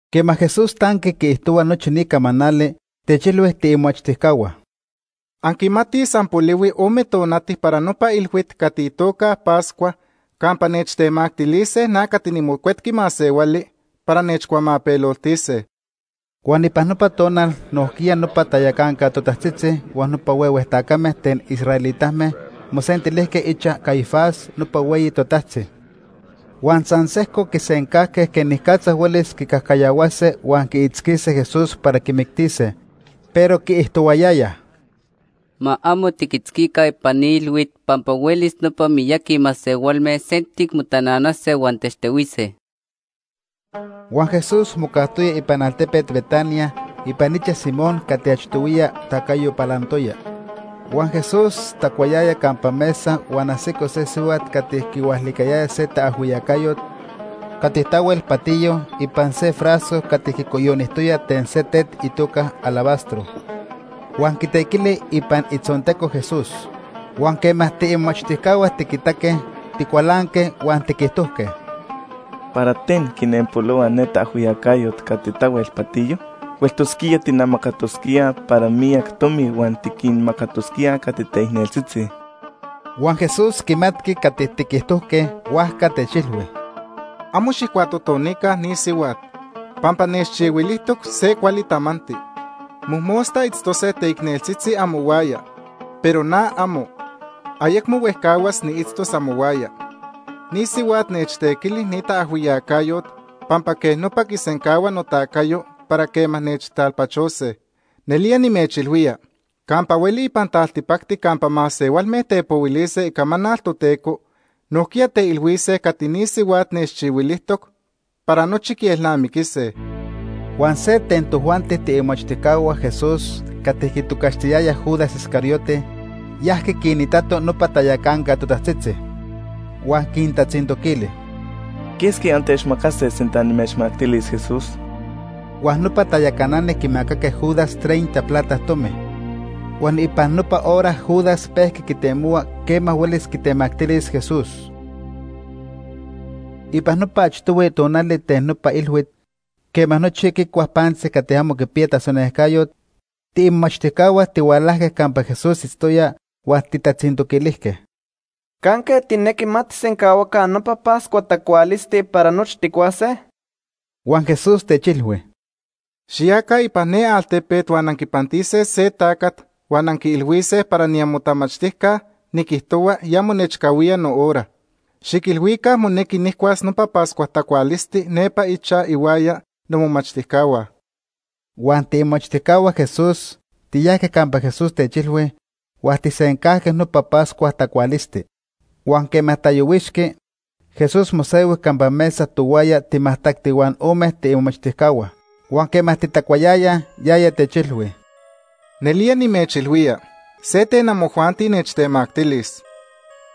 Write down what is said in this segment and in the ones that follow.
Quema Jesús tanqui quiijtohua nochi ni camanali, techilhui tiimomachtijcahua: ―Anquimatij san polihui ome tonati para nopa ilhuit cati itoca Pascua campa nechtemactilise na cati niMocuetqui Masehuali para nechcuamapeloltise. Huan ipan nopa tonal nojquiya nopa tayacanca totajtzitzi huan nopa huehue tacame ten israelitame mosentilijque ichaj Caifás nopa hueyi totajtzi. Huan san sejco quisencajque quenicatza huelis quicajcayahuase huan quiitzquise Jesús para quimictise. Pero quiijtohuayayaj: ―Ma amo tiquitzquica ipan ni ilhuit pampa huelis nopa miyaqui masehualme sentic motananase huan techtehuise. Huan Jesús mocajtoya ipan altepet Betania ipan ichaj Simón cati achtohuiya tacayo palantoya. Huan Jesús tacuayaya campa mesa huan ajsico se sihuat cati quihualicayaya se taajhuiyacayot cati tahuel patiyo ipan se frasco cati quicoyonijtoya ten se tet itoca alabastro. Huan quitequili ipan itzonteco Jesús. Huan quema tiimomachtijcahua tiquitaque, ticualanque huan tiquijtojque: ―¿Para ten quinenpolohua ne taajhuiyacayot cati tahuel patiyo? Hueltosquía tijnamacatosquíaj para miyac tomi huan tiquinmacatosquíaj cati teicneltzitzi. Huan Jesús quimatqui cati tiquijtojque, huajca techilhui: ―Amo xijcuatotonica ni sihuat, pampa nechchihuilijtoc se cuali tamanti. Mojmosta itztose teicneltzitzi amohuaya, pero na amo. Ayecmo huejcahuas niitztos amohuaya. Ni sihuat nechtequili ni taajhuiyacayot pampa quej nopa quisencahua notacayo para quema nechtalpachose. Nelía nimechilhuía, campa hueli ipan taltipacti campa masehualme tepohuilise icamanal Toteco, nojquiya teilhuise cati ni sihuat nechchihuilijtoc para nochi quielnamiquise. Huan se ten tojuanti tiimomachtijcahua Jesús cati quitocaxtiyayaj Judas Iscariote, yajqui quinitato nopa tayacanca totajtzitzi. Huan quintatzintoquili: ―¿Quesqui antechmacase sinta nimechmactilis Jesús? Huan nopa tayacanani quimacaque Judas treinta plata tomi. Huan ipan nopa hora Judas pejqui quitemohua quema huelis quitemactilis Jesús. Ipan nopa achtohui tonali ten nopa ilhuit, quema nochi quicuaj pantzi cati amo quipiya tasonejcayot, tiimomachtijcahua tihualajque campa Jesús itztoya huan tijtatzintoquilijque: ―¿Canque tijnequi ma tijsencahuaca nopa Pascua tacualisti para nochi tijcuase? Huan Jesús techilhui: ―Xiyaca ipan ne altepet huan anquipantise se tacat huan anquiilhuise para niamotamachtijca niquijtohua ya monechcahuía nohora. Xiquilhuica monequi nijcuas nopa Pascua tacualisti nepa ichaj ihuaya nomomachtijcahua. Huan tiimomachtijcahua Jesús tiyajque campa Jesús techilhui huan tijsencajque nopa Pascua tacualisti. Huan quema tayohuixqui, Jesús mosehui campa mesa tohuaya timajtacti huan ome tiimomachtijcahua. Huan quema titacuayayaj, yaya techilhui: ―Nelía nimechilhuía, se ten amojuanti nechtemactilis.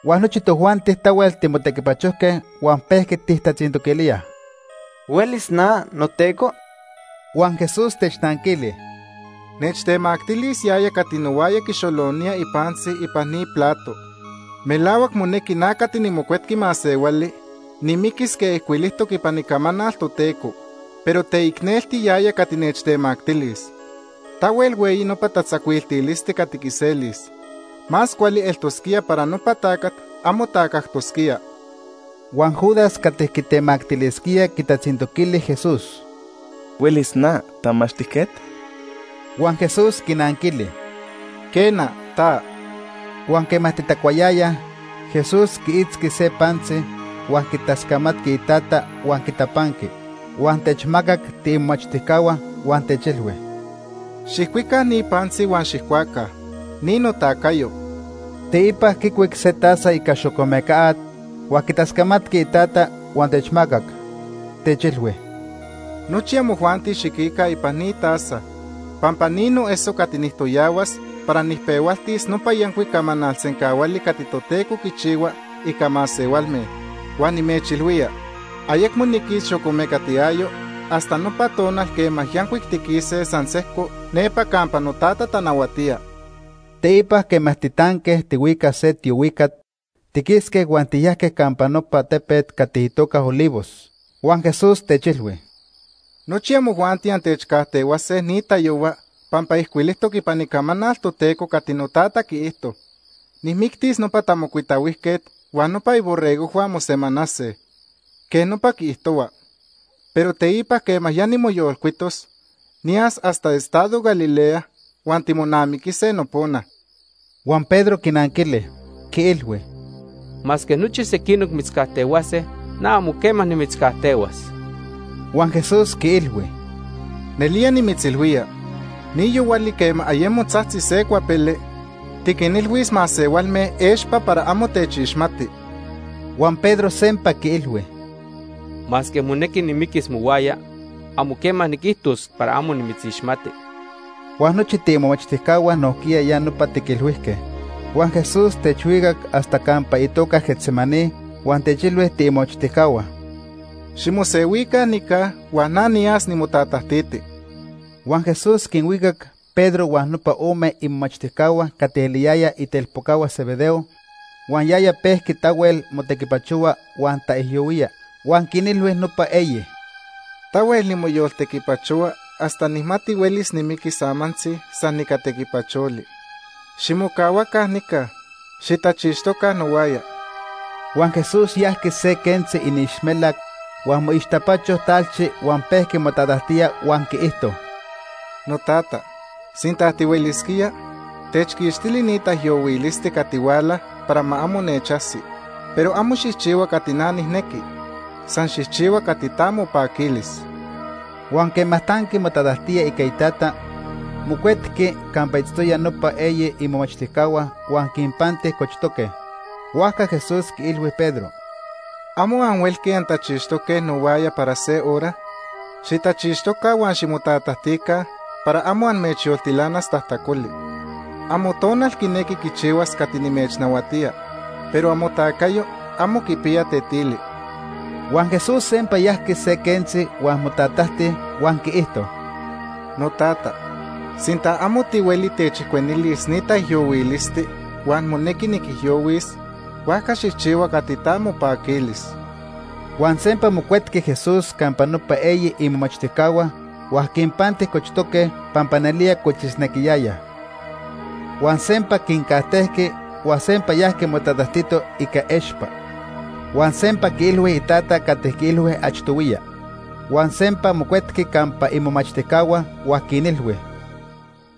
Huan nochi tojuanti tahuel timotequipachojque huan pejqui tijtatzintoquilíaj: ―¿Huelis na, noTeco? Huan Jesús technanquili: ―Nechtemactilis yaya cati nohuaya quixolonía ipantzi ipan ni plato. Melahuac monequi na cati niMocuetqui Masehuali nimiquis quej ijcuilijtoc ipan Icamanal Toteco, pero teicnelti yaya cati nechtemactilis. Tahuel hueyi nopa tatzacuiltilisti cati quiselis. Más cuali eltosquía para nopa tacat amo tacajtosquía. Huan Judas cati quitemactilisquía quitatzintoquili Jesús: ―¿Huelis na, Tamachtijquet? Huan Jesús quinanquili: ―Quena, ta. Huan quema titacuayayaj, Jesús quiitzqui se pantzi huan quitascamatqui Itata huan quitapanqui, huan techmacac tiimomachtijcahua huan techilhui: ―Xijcuica ni pantzi huan xijcuaca. Ni notacayo. Teipa quicuic se taza ica xocomeca at, huan quitascamatqui Itata huan techmacac, techilhui: ―Nochi amojuanti xiquica ipan ni taza, pampa ni noeso cati nijtoyahuas para nijpehualtis nopa yancuic camanal sencahuali cati Toteco quichihua ica masehualme. Huan nimechilhuía, ayecmo niquis xocomecat iayo hasta nopa tonal quema yancuic tiquise san sejco nepa campa noTata tanahuatía. Teipa quema titanque tihuicaj se tiohuicat, tiquisque huan tiyajque campa nopa tepet cati itoca Olivos. Huan Jesús techilhui: ―Nochi amojuanti antechcajtehuase ni tayohua pampa ijcuilijtoc ipan Icamanal Toteco cati noTata quiijto: ‘Nijmictis nopa tamocuitahuijquet huan nopa iborregojhua mosemanase.’ Quej nopa quiijtohua. Pero teipa quema ya nimoyolcuitos, niyas hasta estado Galilea huan timonamiquise nopona. Huan Pedro quinanquili, quiilhui: ―Masque nochi sequinoc mitzcajtehuase, na amo quema nimitzcajtehuas. Huan Jesús quiilhui: ―Nelía nimitzilhuía, ni yohuali quema ayemo tzajtzi se cuapele, tiquinilhuis masehualme expa para amo techixmati. Huan Pedro sempa quiilhui: ―Masque monequi nimiquis mohuaya, amo quema niquijtos para amo nimitzixmati. Huan nochi tiimomachtijcahua nojquiya ya nopa tiquilhuijque. Huan Jesús techhuicac hasta campa itoca Getsemaní huan techilhui tiimomachtijcahua: ―Ximosehuica nica huan na niya nimotatajtiti. Huan Jesús quinhuicac Pedro huan nopa ome imomachtijcahua cati eliyayaj itelpocahua Zebedeo. Huan yaya pejqui tahuel motequipachohua huan taijyohuía. Huan quinilhui nopa eyi: ―Tahuel nimoyoltequipachohua hasta nijmati huelis nimiquis amantzi san ica tequipacholi. Ximocahuaca nica. Xitachixtoca nohuaya. Huan Jesús yajqui se quentzi iniixmelac huan moixtapacho talchi huan pejqui motatajtía huan quiijto: ―Notata, sinta tihuelisquía, techquixtili ni taijyohuilisti cati huala para ma amo nechajsi. Pero amo xijchihua cati na nijnequi, san xijchihua cati ta mopaquilis. Huan quema tanqui motatajtía ica Itata, mocuetqui campa itztoyaj nopa eyi imomachtijcahua huan quinpanti cochtoque. Huajca Jesús quiilhui Pedro: ―¿Amo anhuelque antachixtoque nohuaya para se hora? Xitachixtoca huan ximotatajtica para amo amechyoltilanas tajtacoli. Amotonal quinequi quichihuas cati nimechnahuatía, pero amotacayo amo quipiya tetili. Huan Jesús sempa yajqui se quentzi huan motatajti huan quiijto: ―Notata, sinta amo tihueli techijcuenilis ni taijyohuilisti huan monequi niquijyohuis, huajca xijchihua cati ta mopaquilis. Huan sempa mocuetqui Jesús campa nopa eyi imomachtijcahua huan quinpanti cochtoque pampa nelía cochisnequiyayaj. Huan sempa quincajtejqui huan sempa yajqui motatajtito ica expa. Huan sempa quiilhui Itata cati quiilhui achtohuiya. Huan sempa mocuetqui campa imomachtijcahua, huan quinilhui: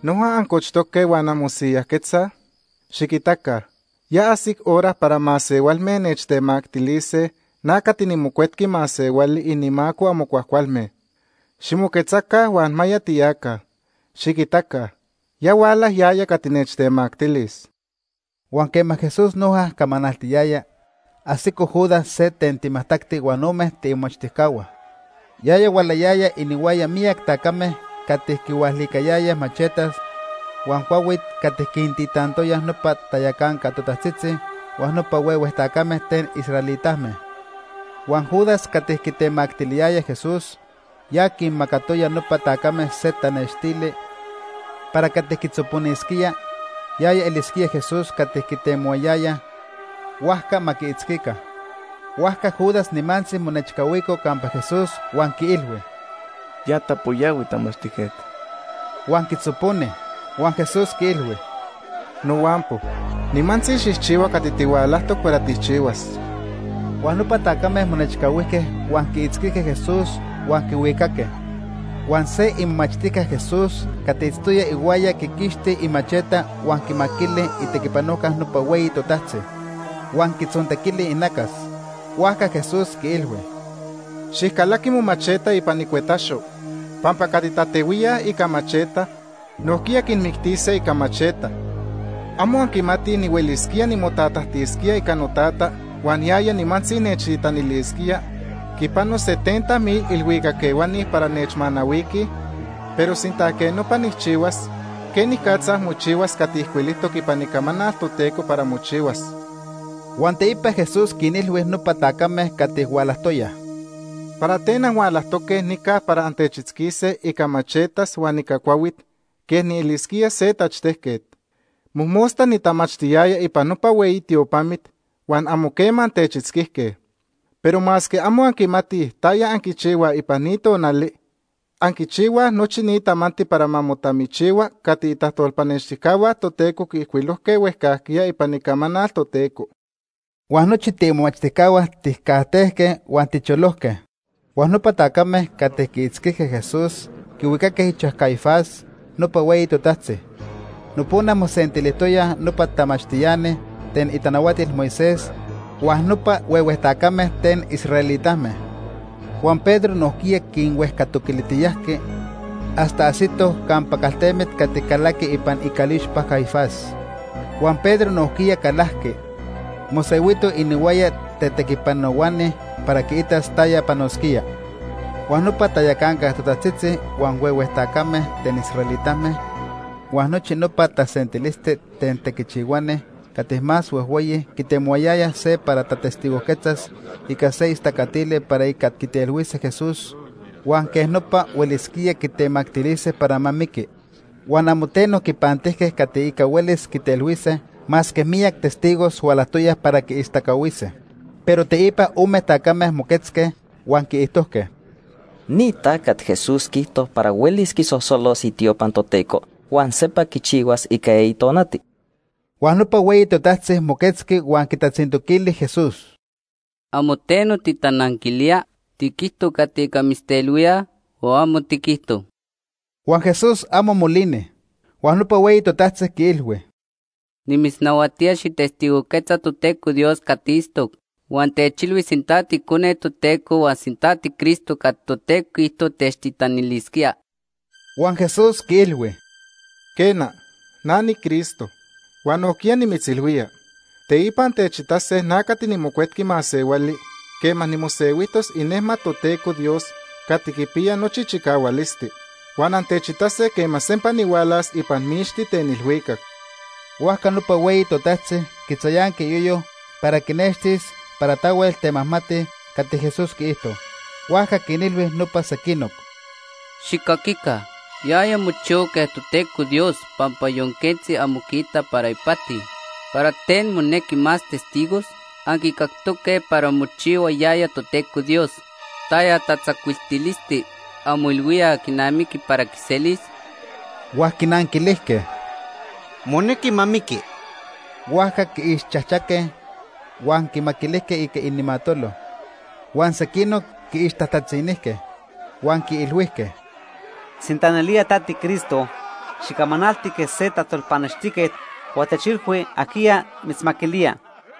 ―¿Noja ancochtoque huan anmosiyajquetzaj? Xiquitaca, ya ajsic hora para masehualme nechtemactilise na cati niMocuetqui Masehuali inimaco amo cuajcualme. Ximoquetzaca huan ma ya tiyaca. Xiquitaca, ya huala yaya cati nechtemactilis. Huan quema Jesús noja camanaltiyaya, ajsico Judas se ten timajtacti huan ome tiimomachtijcahua. Yaya hualayaya inihuaya miyac tacame cati quihualicayayaj machetas huan cuahuit cati quintitantoyaj nopa tayacanca totajtzitzi huan nopa huehue tacame ten israelitame. Huan Judas cati quitemactiliyaya Jesús, ya quinmacatoya nopa tacame se tanextili para cati quitzoponisquía, yaya elisquía Jesús cati quitemohuayayaj, huajca ma quiitzquica. Huajca Judas nimantzi monechcahuico campa Jesús huan quiilhui: ―Ya tapoyahui, tamachtijquet. Huan quitzoponi. Huan Jesús quiilhui: ―Nohuampo, nimantzi xijchihua cati tihualajtoc para tijchihuas. Huan nopa tacame monechcahuijque huan quiitzquijque Jesús, huan quihuicaque. Huan se imomachtijca Jesús cati itztoya ihuaya quiquixti imacheta huan quimaquili itequipanojca nopa hueyi totajtzi, huan quitzontequili inacas. Huajca Jesús quiilhui: ―Xijcalaqui momacheta ipan icuetaxo pampa cati tatehuíaj ica macheta, nojquiya quinmictise ica macheta. ¿Amo anquimatij nihuelisquía nimotatajtisquía ica noTata huan yaya nimantzi nechtitanilisquía quipano setenta mil ilhuicac ehuani para nechmanahuiquij? Pero sinta quej nopa nijchihuas, ¿quenicatza mochihuas cati ijcuilijtoc ipan Icamanal Toteco para mochihuas? Huan teipa Jesús quinilhui nopa tacame cati hualajtoyaj: ―¿Para ten anhualajtoque nica para antechitzquise ica machetas huan ica cuahuit quej nielisquía se tachtejquet? Mojmosta nitamachtiyaya ipan nopa hueyi tiopamit huan amo quema antechitzquijque. Pero masque amo anquimatij taya anquichihuaj ipan ni tonali, anquichihuaj nochi ni tamanti para ma motamichihua cati itajtolpanextijcahua Toteco quiijcuilojque huejcajquiya ipan Icamanal Toteco. Huan nochi tiimomachtijcahua tijcajtejque huan ticholojque. Huan nopa tacame cati quiitzquijque Jesús quihuicaque ichaj Caifás, nopa hueyi totajtzi. Nopona mosentilijtoyaj nopa tamachtiani ten itanahuatil Moisés huan nopa huehue tacame ten israelitame. Huan Pedro nojquiya quinhuejcatoquilijtiyajqui hasta ajsitoj campa caltemit cati calaqui ipan icalixpa Caifás. Huan Pedro nojquiya calajqui, mosehuito inihuaya tetequipanohuani para quiitas taya panosquía. Huan nopa tayacanca totajtzitzi huan huehue tacame ten israelitame huan nochi nopa tasentilisti ten tequichihuani cati más huejhueyi quitemohuayayaj se para tatestigojquetzas ica se istacatili para ica quitelhuise Jesús huan quej nopa huelisquíaj quitemactilise para ma miqui. Huan amo teno quipantijque cati ica huelis quitelhuise, masque miyac testigos hualajtoyaj para quiistacahuise. Pero teipa ome tacame moquetzque, huan quiijtojque: ―Ni tacat Jesús quiijto para huelis quisosolos itiopa Toteco huan sempa quichihuas ica eyi tonati. Huan nopa hueyi totajtzi moquetzqui huan quitatzintoquili Jesús: ―¿Amo teno titananquilía? ¿Tiquijto cati ica mitztelhuíaj o amo tiquijto? Huan Jesús amo molini. Huan nopa hueyi totajtzi quiilhui: ―Nimitznahuatía xijtestigojquetza Toteco Dios cati itztoc, huan techilhui sinta tiIcone Toteco huan sinta tiCristo cati Toteco quiijto techtitanilisquía. Huan Jesús quiilhui: ―Quena, na niCristo. Huan nojquiya nimitzilhuía, teipa antechitase na cati niMocuetqui Masehuali quema nimosehuijtos inejmat Toteco Dios cati quipiya nochi chicahualisti. Huan antechitase quema sempa nihualas ipan mixti ten ilhuicac. Huajca nopa hueyi totajtzi quitzayanqui iyoyo para quinextilis para tahuel temajmati ica cati Jesús quiijto. Huajca quinilhui nopa sequinoc: ―Xijcaquica, yaya mochihua quej Toteco Dios pampa yon quentzi amo quiita para ipati. ¿Para ten monequi más testigos? Anquicactoque para mochihua yaya Toteco Dios. ¿Taya tatzacuiltilisti anmoilhuíaj quinamiqui para quiselis? Huan quinanquilijque: ―Monequi ma miqui. Huajca quiixchajchaque, huan quimaquilijque ica inimatolo. Huan sequinoc quiixtajtatzinijque, huan quiilhuijque: ―Sinta nelía ta tiCristo, xicamanalti quej se tajtolpanextijquet huan techilhui ajquiya mitzmaquilía.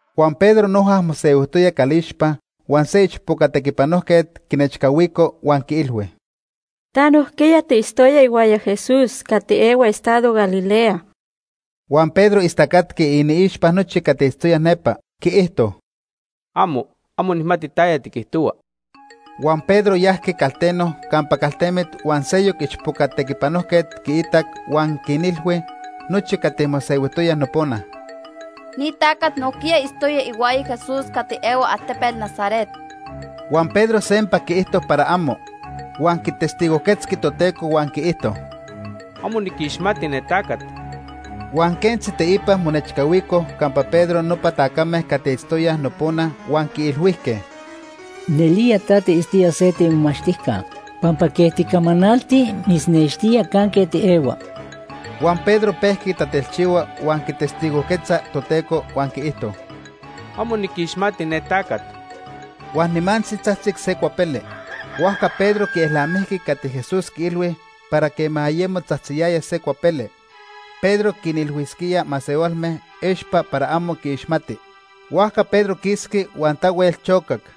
Huan Pedro noja mosehuijtoya calixpa huan se ichpoca tequipanojquet quinechcahuico huan quiilhui: ―Ta nojquiya tiitztoya ihuaya Jesús cati ehua estado Galilea. Huan Pedro istacatqui iniixpa nochi cati itztoyaj nepa. Quiijto: ―Amo, amo nijmati taya tiquijtohua. Huan Pedro yajqui calteno campa caltemit huan seyoc ichpoca tequipanojquet quiitac huan quinilhui nochi cati mosehuijtoyaj nopona: ―Ni tacat nojquiya itztoya ihuaya Jesús cati ehua altepet Nazaret. Huan Pedro sempa quiijto para amo, huan quitestigojquetzqui Toteco huan quiijto: ―Amo niquixmati ne tacat. Huan quentzi teipa monechcahuicoj campa Pedro nopa tacame cati itztoyaj nopona huan quiilhuijque: ―Nelía ta tiitztoya se tiimomachtijca pampa quej ticamanalti mitznextía canque tiehua. Huan Pedro pejqui tatelchihua huan quitestigojquetza Toteco, huan quiijto: ―Amo niquixmati ne tacat. Huan nimantzi tzajtzic se cuapele. Huajca Pedro quielnamijqui cati Jesús quiilhui para quema ayemo tzajtziyaya se cuapele, Pedro quinilhuisquía masehualme expa para amo quiixmati. Huajca Pedro quisqui huan tahuel chocac.